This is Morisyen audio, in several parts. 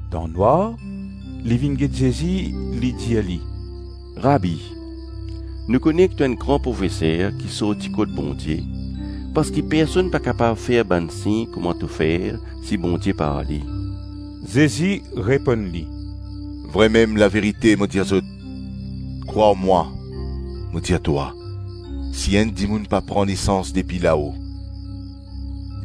Dan nwar, li vinn get Zezi, li dir li, “Rabi, nou kone ki to enn gran profeser ki sorti kot Bondie parski personn pa kapav fer bann sign kouma to fer, si Bondie pa ar li.” Zezi reponn li, “Vremem, laverite mo dir zot, krwar mwa mo dir twa, si enn dimoun pa pran nesans depi lao,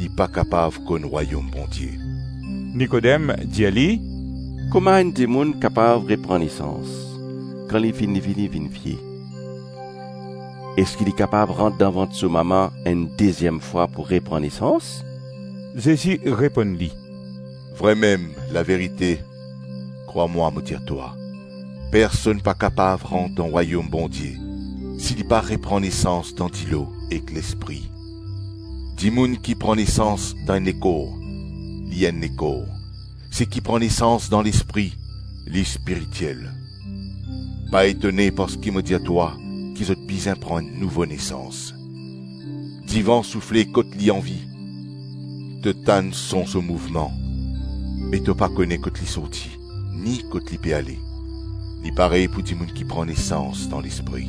li pa kapav konn Rwayom Bondie.” Nikodem dir li, “Kouma enn dimoun kapav repran nesans, kan li finn fini vinn vie? Eski li kapav rant dan vant so mama enn deziem fwa pou repran nesans?” Zezi reponn li, “Vremem, laverite krwar mwa mo dir twa, personn pa kapav rant dan Rwayom Bondie, si li pa repran nesans dan dilo ek Lespri. Dimoun ki pran nesans dan enn lekor, li enn lekor, seki pran nesans dan Lespri, li spiritiel. Pa etone parski mo dir twa ki zot bizin pran enn nouvo nesans. Divan soufle kot li anvi, to tann son so mouvman me to pa kone kot li sorti ni kot li pe ale; li parey pou dimoun ki pran nesans dan Lespri.”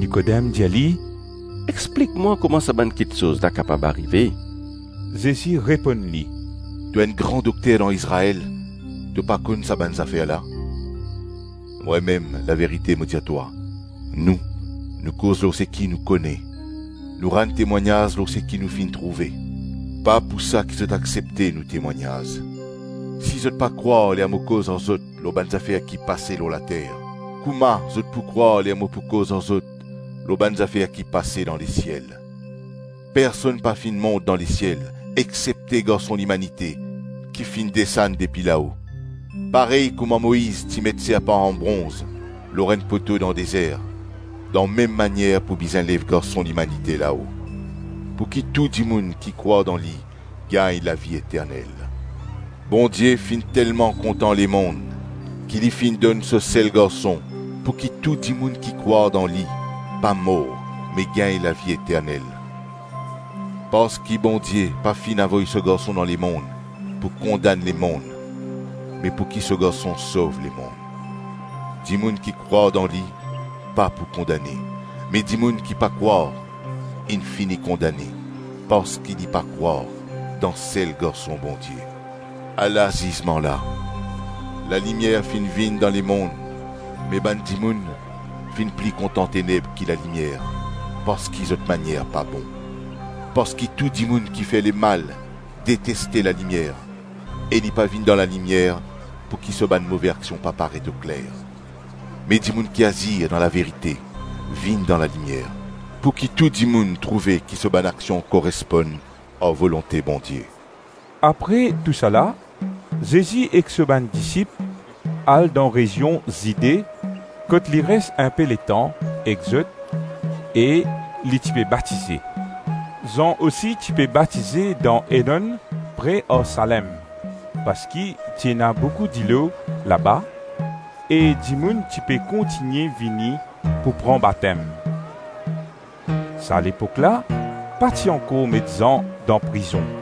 Nikodem dir li, “Explik mwa kouma sa bann kiksoz la kapav arive?” Zezi reponn li, “To enn gran dokter dan Izrael, to pa konn sa bann zafer la? Vremem, laverite mo dir twa, nou, nou koz lor seki nou kone, nou rann temwagnaz lor seki nou finn trouve, pa pou sa ki zot aksepte nou temwagnaz. Si zot pa krwar ler mo koz ar zot lor bann zafer ki pase lor later, kouma zot pou krwar ler mo pou koz ar zot lor bann zafer ki pase dan lesiel? Personn pa finn mont dan lesiel, exsepte Garson Limanite ki finn desann depi lao. Parey kouma Moiz ti met serpan an bronz lor enn poto dan dezer, dan mem manier pou bizin lev Garson Limanite lao, pou ki tou dimoun ki krwar dan li gagn lavi eternel. Bondie finn telman kontan lemonn, ki li finn donn so Sel Garson pouki tou dimoun ki krwar dan Li, pa mor me gagn lavi eternel. Parski Bondie pa finn avoy so Garson dan lemonn pou kondann lemonn me pouki so Garson sov lemonn. Dimoun ki krwar dan li, pa pou kondane me dimoun ki pa krwar, inn fini kondane parski li pa krwar dan Sel Garson Bondie. Ala zizman la: lalimier finn vinn dan lemonn me bann dimoun finn pli kontan teneb ki lalimier parski zot manier pa bon. Parski tou dimoun ki fer lemal deteste lalimier e li pa vinn dan lalimier pouki so bann move aksion pa paret okler. Me dimoun ki azir dan laverite vinn dan lalimier pouki tou dimoun trouve ki so bann aksion koresponn ar volonte Bondie. Apre tousala, Zezi ek so bann disip al dan rezion Zide kot li res inpe letan ek zot e li ti pe batize. Zan osi ti pe batize dan Enonn pre ar Salem parski ti ena boukou dilo laba e dimoun ti pe kontigne vini pou pran batem. (Sa lepok la, pa ti ankor met Zan dan prizon).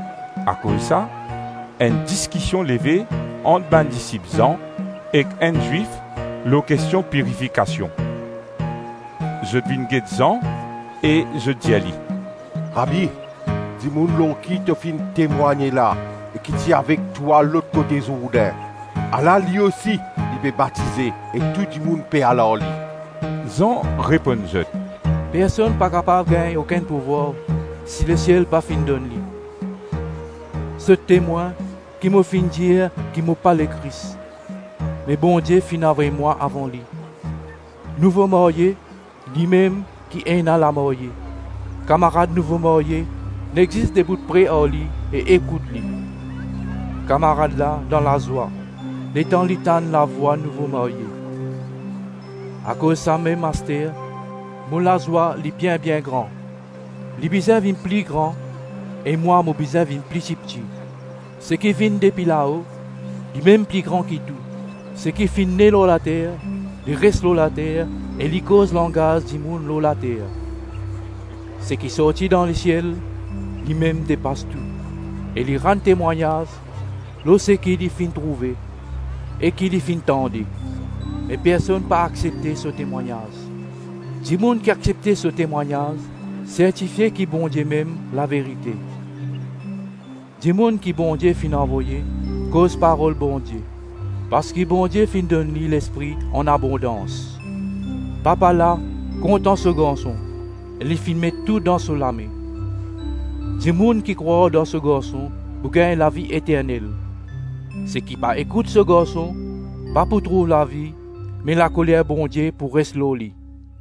Akoz sa, enn diskision leve ant bann disip Zan ek enn Zwif lor kestion pirifikasion. Zot vinn get Zan e zot dir li, “Rabi, dimoun lor ki to finn temwagne-la e ki ti avek twa lot kote Zourdin, ala, li osi li pe batize e tou dimoun pe al ar li.” Zan reponn zot, “Personn pa kapav gagn okenn pouvwar si lesiel pa finn donn li. Zot temwin ki mo finn dir ki mo pa Lekris, me Bondie finn avoy mwa avan li. Nouvo marye, limem ki ena lamarye; kamarad nouvo marye nek zis debout pre ar li e ekout li; kamarad la dan lazwa letan li tann lavwa nouvo marye. Akoz samem aster, mo lazwa li bien-bien gran. Li bizin vinn pli gran e mwa, mo bizin vinn pli tipti. Seki vinn depi lao, limem pli gran ki tou; seki finn ne lor later, li res lor later e li koz langaz dimoun lor later; seki sorti dan lesiel, limem depas tou. E li rann temwagnaz lor seki li finn trouve e ki li finn tande, me personn pa aksepte so temwagnaz. Dimoun ki aksepte so temwagnaz sertifie ki Bondie mem laverite. Dimoun ki Bondie finn avoye, koz parol Bondie, parski Bondie finn donn li Lespri anabondans. Papa la kontan so Garson e li finn met tou dan so lame. Dimoun ki krwar dan so Garson pou gagn lavi eternel, seki pa ekout so Garson, pa pou trouv lavi me lakoler Bondie pou res lor li.”